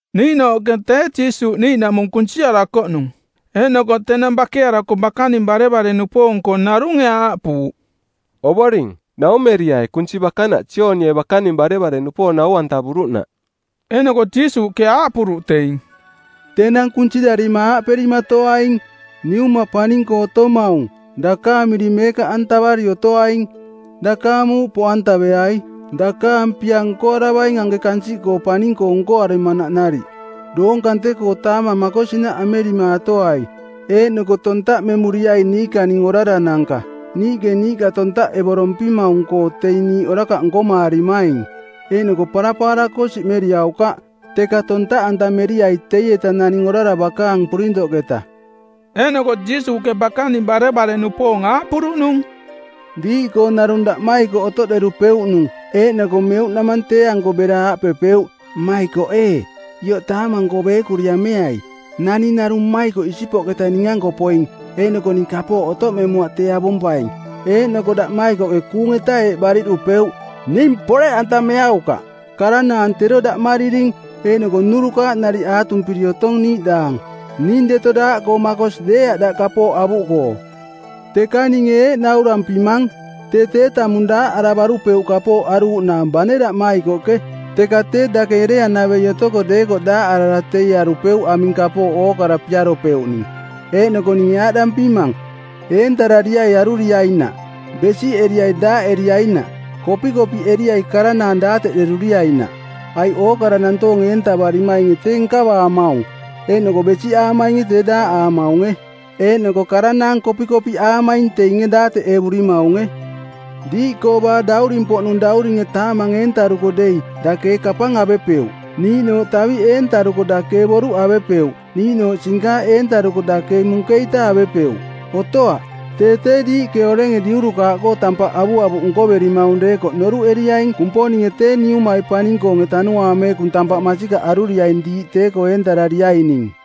Niiꞌnooꞌke tee Jiisuuꞌ niiꞌnaꞌmung kunsiarakoꞌnung. Eeꞌnoko tenang bakearako bakaning barevare-nupoong-koo narunge aaꞌpuuꞌ, “Ovoring, naumeriai kunsi bakanaꞌ Joonie bakaning barevare-nupoong nau-antavuruꞌnaꞌ.” Eeꞌnoko Jiisuuꞌke aaꞌpuruꞌ teing, “Tenang kunsirarima aaꞌperimatoaing: Niuma paning-koo otomaung, dakaang miring meekaꞌantavari otoaing; dakaang muuꞌ poꞌantaveai; dakaang pia nkoaravaing anke kansiꞌkoo paning-koo nkoaramanaꞌ nariꞌ. Doong kante-koo taamang makosinaꞌ amerimaatoai; Eeꞌnoko tontaꞌmemuriai niikaning orarananka, niiꞌke niiꞌka tontaꞌevorompimaung-koo teing niiꞌ orakaꞌ nkomaarimaing. Eeꞌnoko parapaara-koo siꞌmeriaukaꞌ, teka tontaꞌantameriai teieta naning orara bakaang purintoꞌketa.” Eeꞌnoko Jiisuuꞌke bakaning barevare-nupoong aaꞌpuruꞌnung, “Diiꞌkoo narung daꞌmaikoꞌ otoꞌderupeuꞌnung eeꞌnoko meuꞌnamang tee-anko bera aaꞌpepeuꞌ, ‘Mmaikoꞌ ee, ioꞌ taamang-koo beekuri ameai. Naning narung mmaikoꞌ isipoꞌketa ning-anko poing eeꞌnoko ning kapooꞌ otoꞌmemuaꞌ tee avompaing.’ Eeꞌnoko daꞌmaikoꞌke kuung-eta eeꞌ bariꞌdupeuꞌ, ‘Ning poreꞌantameaukaꞌ. Karanaang tero daꞌmariring eeꞌnoko nnurukaaꞌ nariꞌ aatumpiri otong niiꞌdaang. Ning deto daaꞌkoo makosi deeaꞌ daꞌ kapooꞌ avuꞌkoo.’ Teka ninge eeꞌ naurampimang, tee tee tamung daaꞌaravarupeuꞌ kapooꞌ aruuꞌnaang bane daꞌmaikoꞌke, teka tee dake ereanavei otoko deekoꞌ daaꞌarara teie arupeuꞌ aming kapooꞌ ookara piaropeuꞌning. “Eeꞌnoko ninge aaꞌdampimang, Eentarariai aruriainaꞌ. Besiꞌeriai daaꞌeriainaꞌ. Kopikopiꞌeriai karanaang daateꞌderuriainaꞌ. Aiꞌ ookara nantoonge eentavarimainge tee nkavaamaung, eeꞌnoko besiꞌaamainge tee daaꞌaamaunge, eeꞌnoko karanaang kopikopiꞌaamaing teinge daateꞌevurimaunge. Diiꞌkoo baa dauring-poꞌnung dauringe taamang eentaruko dei dake ee kapang avepeuꞌ, niiꞌnooꞌ taviꞌ eentaruko dake ee boruꞌ avepeuꞌ, niiꞌnooꞌ sinkaaꞌ eentaruko dake ee munkeita avepeuꞌ? Otoaꞌ! Tee tee diiꞌke orenge diurukaaꞌkoo tampaꞌ avuavuꞌ nkoverimaung deekoꞌ noruꞌeriaing Kumponinge tee Niumai paning-koonge Tanuaang Meekung tampaꞌ masikaꞌ aruriaing diiꞌ tee-koo eentarariaining.”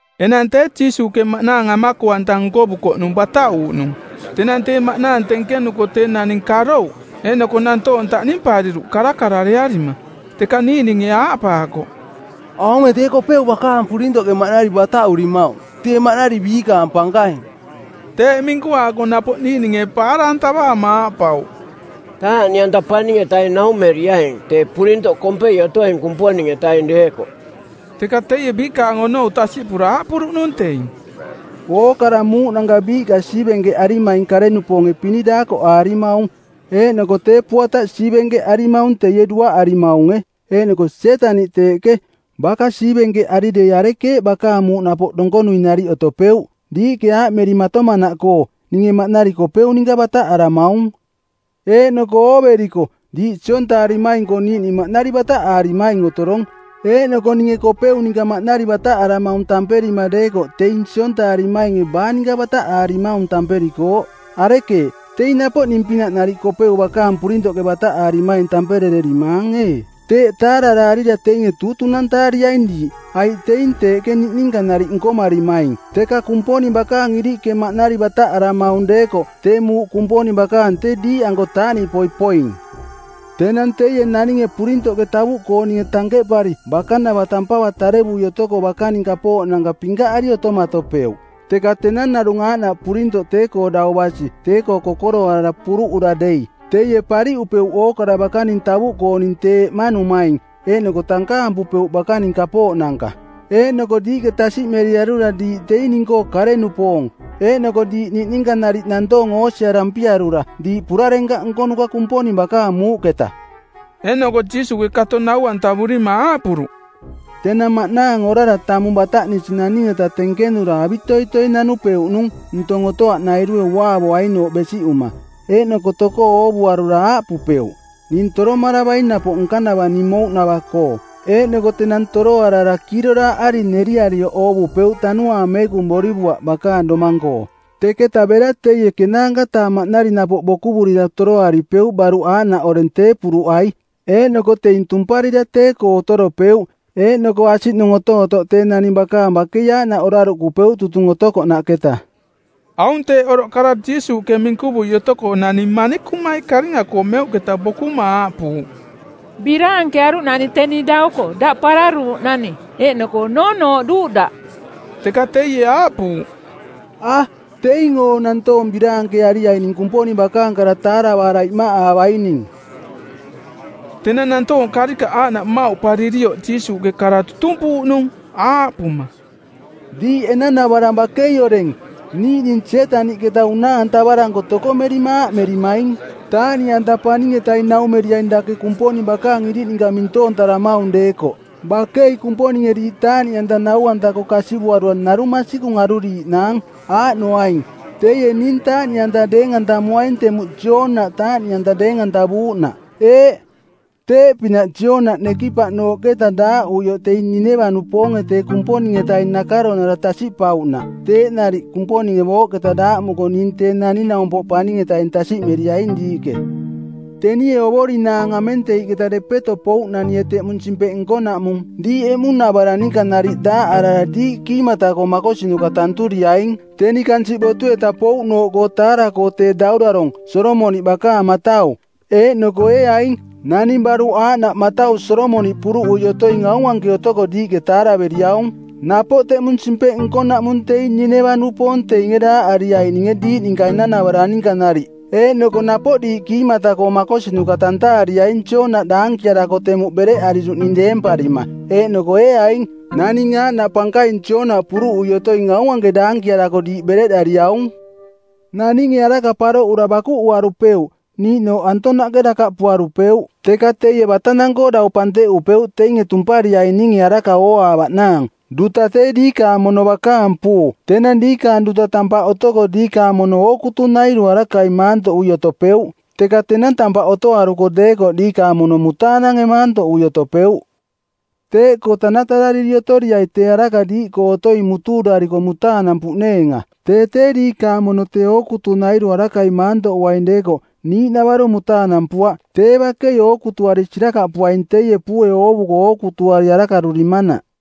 Enang tee Jiisuuꞌke maꞌnaang amako-anta nkovukoꞌnung bataꞌuuꞌnung. Tenang tee maꞌnaang tenkenuko tee naning karouꞌ. Eeꞌnoko nantoong taꞌnimpariruꞌ karakararearima. Teka niiꞌninge aaꞌpaakoꞌ, “Aunge tee Kopeu bakaang purintoꞌke maꞌnari bataꞌurimaung, tee maꞌnari biikaang pankaing.” Teeꞌ minkuaako napoꞌ niiꞌninge paara-antavaama aaꞌpauꞌ, “Taaꞌniꞌanta paning-etaing naumeriaing tee purintoꞌ kompei otoing Kumponing-etaing deekoꞌ.” Teka teie biikaang onou tasiꞌpura aaꞌpuruꞌnung teing, “Ookara muuꞌnanka biiꞌka siivenkeꞌarimaing kare-nupoonge pini daakoꞌaarimaung, eeꞌnoko tee puataꞌ siivenkeꞌarimaung teie duaꞌarimaunge. Eeꞌnoko Sietaniꞌ teeꞌke, baka siivenkeꞌari dei arekeeꞌ bakaang muuꞌ napoꞌ donkonui nariꞌ otopeuꞌ? Diiꞌke aaꞌmerimatomanaꞌkoo: ninge maꞌnari Kopeu ninka bataꞌaramaung. Eeꞌnoko ooveriko diiꞌ siontaarimaing-koo niiꞌning maꞌnari bataꞌaarimaing otorong. Eeꞌnoko ninge Kopeu ninka maꞌnari bataꞌaramaung tamperima deekoꞌ teing siontaarimainge baa ninka bataꞌaarimaung tamperikooꞌ? Arekeeꞌ, teing napoꞌ ning-pinaꞌ nariꞌ Kopeu bakaang purintoꞌke bataꞌaarimaing tamperererimaang ee? Teeꞌ taararaarira teinge tuutunantaariaing diiꞌ, aiꞌ teing teeꞌke niꞌninka nariꞌ nkomarimaing. Teka Kumponing bakaang iriꞌke maꞌnari bataꞌaramaung deekoꞌ tee muuꞌ Kumponing bakaang tee diiꞌanko taaꞌniꞌpoi poing. “Tenang teie naninge purintoꞌke tavuꞌkooninge tankeꞌpari bakanava tampava tarevui otoko bakaning kapooꞌnanka pinkaꞌari otomatopeuꞌ. Teka tenang narung aaꞌnaꞌ purintoꞌ tee-koo dau basi tee-koo kokoroarara puruꞌura dei, teie pariꞌupeuꞌ ookara bakaning tavuꞌkooning tee eꞌmanumaing eeꞌnoko tankaampupeuꞌ bakaning kapooꞌnanka. Eeꞌnoko diiꞌke tasiꞌmeriarura diiꞌ teing ning-koo kare-nupoong, eeꞌnoko diiꞌ niꞌninka nariꞌ nantoong oosiarampiarura diiꞌ purarenkaꞌ nkonuka Kumponing bakaang muuꞌketa.” Eeꞌnoko Jiisuuꞌke kato nau-antavurima aaꞌpuruꞌ, “Tenang maꞌnaang orara tamung bataꞌnisi naning-eta tenkenura avitoitoi nanupeuꞌnung ntong otoaꞌnairue uaavoainooꞌ besiꞌuma, eeꞌnoko tokoo oovuarura aaꞌpupeuꞌ, ‘Ning toromaravaing napoꞌ nkanava ning mouꞌnava-koo.’ Eeꞌnoko tenang toroarara kiiroraaꞌari neriarioꞌ oovupeuꞌ Tanuaang Meekung borivuaꞌ bakaang domang-koo. Teketa bera teie ˜kenaanka-taa maꞌnari napoꞌ bokuvurira toroaripeuꞌ baruꞌ aaꞌnaꞌ oreng tee puruꞌai. Eeꞌnoko teing tumparira tee-koo otoropeuꞌ, eeꞌnoko asiꞌnung otootoꞌ tee naning bakaang bakei aaꞌnaꞌ oraruꞌkupeuꞌ tutung otokoꞌnaꞌketa.” Aung teeꞌ oroꞌ kara Jiisuuꞌke minkuvui otoko nani manikumai karinga-koo meuꞌketa bokuma aaꞌpuuꞌ, “Biraankearuꞌnani teni dauko daꞌ pararuuꞌnani eeꞌnoko noonooꞌduuꞌ daꞌ.” Teka teie aaꞌpuuꞌ, “A, teing oo nantoong biraankeariaining Kumponing bakaang kara taaravaara iꞌmaꞌaavaining.” Tenang nantoong karikaꞌ aaꞌnaꞌ mmauꞌparirioꞌ Jiisuuꞌke kara tutumpuuꞌnung, aaꞌpuma, “Diiꞌ enanavarang bakei oreng, niiꞌning Sietaniꞌketa una-antavaranko tokomerima aaꞌmerimaing, ‘Taaꞌniꞌanta paning-etaing naumeriaing dake Kumponing bakaang iriꞌninka mintoontaramaung deekoꞌ.’ Bakei Kumponinge diiꞌ taaꞌniꞌanta nau-anta-koo kasivuarura narung masikung aruriiꞌnaang, aaꞌnoaing: teie ning taaꞌniꞌanta deeng-antamuaing temuꞌ Joonaꞌ taaꞌniꞌanta deeng-antavuuꞌnaꞌ. Eeꞌ, teeꞌpinaꞌ Joonaꞌ nekipaꞌnooꞌketa daaꞌuioꞌ teing Nineva-nupoonge tee Kumponing-etaing nakaronara tasiꞌpauꞌnaꞌ teeꞌ nariꞌ Kumponinge booꞌketa daaꞌmuko ning Tee Naning-naumpoꞌ Paning-etaing tasiꞌmeriaing diiꞌke. Tenie ovorinaang amenteiꞌketa depeto pouꞌnanie teꞌmung simpeꞌ nkonaꞌmung diiꞌ emuꞌnavarang ninka nariꞌ daaꞌarara diiꞌ kiimata-koo makosinuka tanturiaing, teni kansiꞌ botu-etaꞌ pouꞌnooꞌkoo taara-koo tee daurarong˜ Solomoniꞌ bakaang matau, eeꞌnoko ee aing, naning baruꞌ aaꞌnaꞌ matau Solomoniꞌ puruꞌui otoing aung anke otoko diiꞌke taaraveriaung. Napoꞌ teꞌmung simpeꞌ nkonaꞌmung teing Nineva-nupoong teinge daaꞌariaininge diiꞌ ninka enanavarang ninka nariꞌ eeꞌnoko napoꞌ diiꞌ kiimata-koo makosinuka tantaariaing Joonaꞌ daankiarako temuꞌ bereꞌariruꞌning deemparima, eeꞌnoko ee aing, naning aaꞌnaꞌ pankaing Joonaꞌ puruꞌui otoing aung anke daankiarako diiꞌ bereꞌdariaung. “Naninge araka paroꞌura bakuꞌuarupeuꞌ, niiꞌnooꞌ antonaꞌke dakaꞌpuarupeuꞌ, teka teie batanang-koo dau panteꞌupeuꞌ teinge tumpariaininge araka ooaavaꞌnaang. Duta tee diikaang mono bakaang puu. Tenang diikaang duta tampaꞌ otoko diikaang mono ootukunairu arakai maantoꞌui otopeuꞌ, teka tenang tampaꞌ otoaruko deekoꞌ diikaang mono mutaanange maantoꞌui otopeuꞌ. Teeꞌkoo tanatarariri otoriai tee araka diiꞌkoo otoing mutuurariko mutaanampuꞌneenga. Tee tee diikaang mono tee ookutunairu arakai maantoꞌuaing deekoꞌ niiꞌnavaro mutaanampuaꞌ tee bakei ookutuari sirakaꞌpuaing teie puue oovuko ookutuari arakarurimanaꞌ.”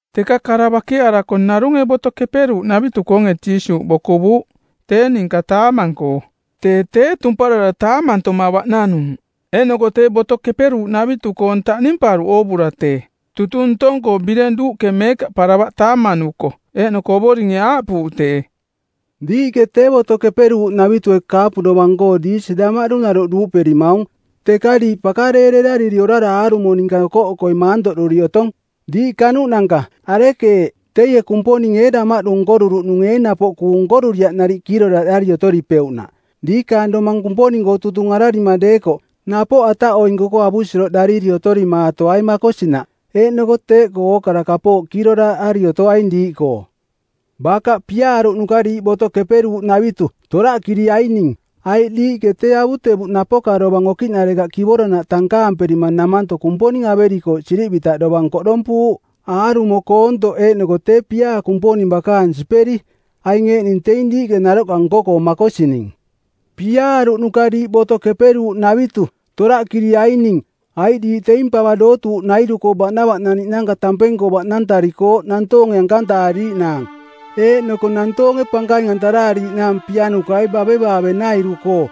Teka kara bakearako narunge Boto Keperuuꞌnavitu-koonge Jiisuuꞌ bokuvuuꞌ tee ninka taamang-koo. Tee tee tumparara taamantoma baꞌnanuuꞌ. Eeꞌnoko tee Boto Keperuuꞌnavitu-koong taꞌnimparuꞌ oovura tee tutung ntong-koo bireng duuꞌke meekaꞌparavaꞌ taamanuko. Eeꞌnoko Ovoringe aaꞌpuuꞌ tee, “Diiꞌke tee Boto Keperuuꞌnavitue kaapu dovang-koo diisi damaꞌdu naroꞌ duuꞌperimaung teka diiꞌ pakareererariri orara aarumo ninka okoꞌokoi maantoꞌduri otong. Diiꞌ kanuꞌnanka. Arekeeꞌ, teie Kumponinge damaꞌdu nkoruruꞌnunge ee napoꞌ kuung nkoruriaꞌ nariꞌ kiiroraaꞌdariri otoripeuꞌnaꞌ? Diikaang domang Kumponing-koo tutung ararima deekoꞌ, napoꞌ ataꞌoinku-koo avusiroꞌrariri otorimaatoai makosinaꞌ, eeꞌnoko teeꞌkoo ookara kapooꞌ kiiroraaꞌari otoaing diiꞌkoo. “Bakaꞌ piaaruꞌnuka diiꞌ Boto Keperuuꞌnavitu, toraꞌkiriaining, aiꞌ diiꞌke tee avutevuꞌ napoka dovang okiꞌnarekaꞌ kivoranaꞌ tankaamperima namanto Kumponing averikooꞌ sirivitaꞌ dovang koꞌdompuuꞌ; aarumo koontoꞌ eeꞌnoko tee piaa Kumponing bakaang siperi. Aing eeꞌning teing diiꞌke naroꞌka nko-koo makosining. Piaaruꞌnuka diiꞌ Boto Keperuuꞌnavitu, toraꞌkiriaining, aiꞌ diiꞌ teing pava dootuuꞌnairu-koo baꞌnavaꞌnaniꞌnanka tampeng-koo baꞌnantarikooꞌ nantoonge ankantaariiꞌnaang, eeꞌnoko nantoonge pankaing-antaraariiꞌnaang pianukai bavevaave-nairu-koo.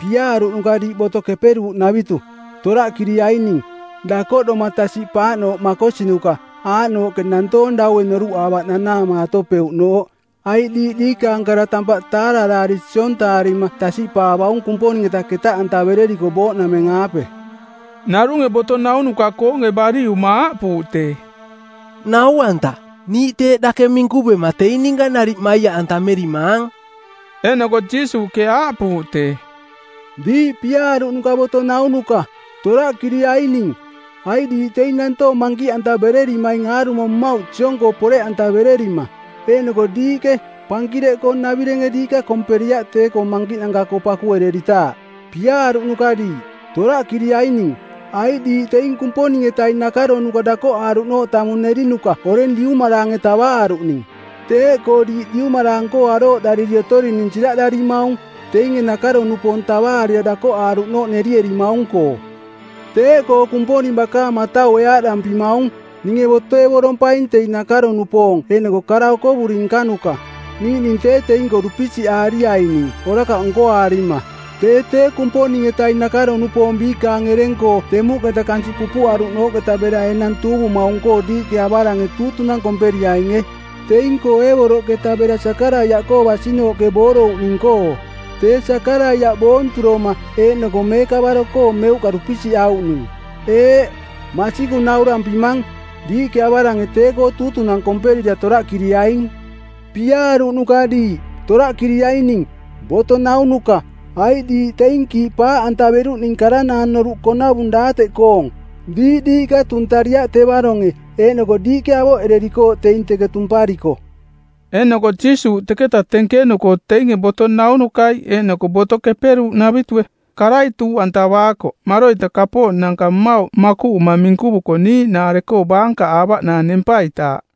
Piaaruꞌnuka diiꞌ Boto Keperuuꞌnavitu, toraꞌkiriaining, dakoꞌdoma tasiꞌpaaꞌnooꞌ makosinuka aaꞌnooꞌke nantoong daue noruꞌaavaꞌ nanaamaatopeuꞌnooꞌ, aiꞌ diiꞌ diikaang kara tampaꞌ taararaari siontaarima tasiꞌpaavaung Kumponing-eta ketaꞌantavereriko booꞌnameng-aape.” Narunge boto naunuka-koonge bariꞌuma aaꞌpuuꞌ tee, “Nau-anta, niiꞌ teeꞌ dake minkuvema teing ninka nariꞌ maiaꞌantamerimaang.” Eeꞌnoko Jiisuuꞌke aaꞌpuuꞌ tee, “Diiꞌ piaaruꞌnuka boto naunuka, toraꞌkiriaining, aiꞌ diiꞌ teing nantoong mankiꞌantavererimaing aarumo mmauꞌ siong-koo poreꞌantavererima, eeꞌnoko diiꞌke pankireꞌkoo-navirenge diiꞌka komperiaꞌ tee-koo mankiꞌnanka-koo pakuereritaaꞌ. Piaaruꞌnuka diiꞌ, toraꞌkiriaining, aiꞌ diiꞌ teing Kumponing-etaing nakaronuka dakoꞌaaruꞌnooꞌ tamung nerinuka oreng diumaraange tavaaruꞌning. Teeꞌkoo diiꞌ diumaraang-koo arooꞌdariri otorining siraꞌdarimaung, teinge nakaro-nupoong tavaarira dakoꞌaaruꞌnooꞌ nerierimaung-koo. Teeꞌkoo Kumponing bakaang mataue aaꞌdampimaung, ‘Ninge botoevorompaing teing nakaro-nupoong eeꞌnoko kara okovuri nkanuka, niiꞌning tee teing-koo dupisiꞌaariaining orakaꞌ nkoaarima.’ Tee tee Kumponing-etaing nakaro-nupoong biikaang ereng-koo temuꞌketa kansiꞌ pupuꞌaruꞌnooꞌketa bera enang tuuvumaung-koo diiꞌke avarange tuutunang˜ komperiainge, teing-koo Eebeloꞌketa bera Sakaraiaꞌkoo basinooꞌke boorouꞌning-koo, tee Sakaraiaꞌ boonturoma eeꞌnoko meekavaro-koo meuꞌka dupisiꞌauꞌnung. Eeꞌ, masikung naurampimang, diiꞌke avarange tee-koo tuutunang komperira toraꞌkiriaing; Piaaruꞌnuka diiꞌ, toraꞌkiriaining, boto naunuka, aiꞌ diiꞌ teing kiiꞌ paaꞌantaveruꞌning karanaang noruꞌkoonavung daateꞌkoong. Diiꞌ diiꞌka tuntariaꞌ tevaronge eeꞌnoko diiꞌke avoꞌererikooꞌ teing teke tumpariko.” Eeꞌnoko Jiisuuꞌ teketa tenkenuko teinge boto naunukai eeꞌnoko Boto Keperuuꞌnavitue karai tuuꞌantavaakoꞌ maroita kapooꞌnanka mmauꞌ makuꞌuma minkuvuko niiꞌnaare-koo baankaꞌaavaꞌnaang nempaitaaꞌ.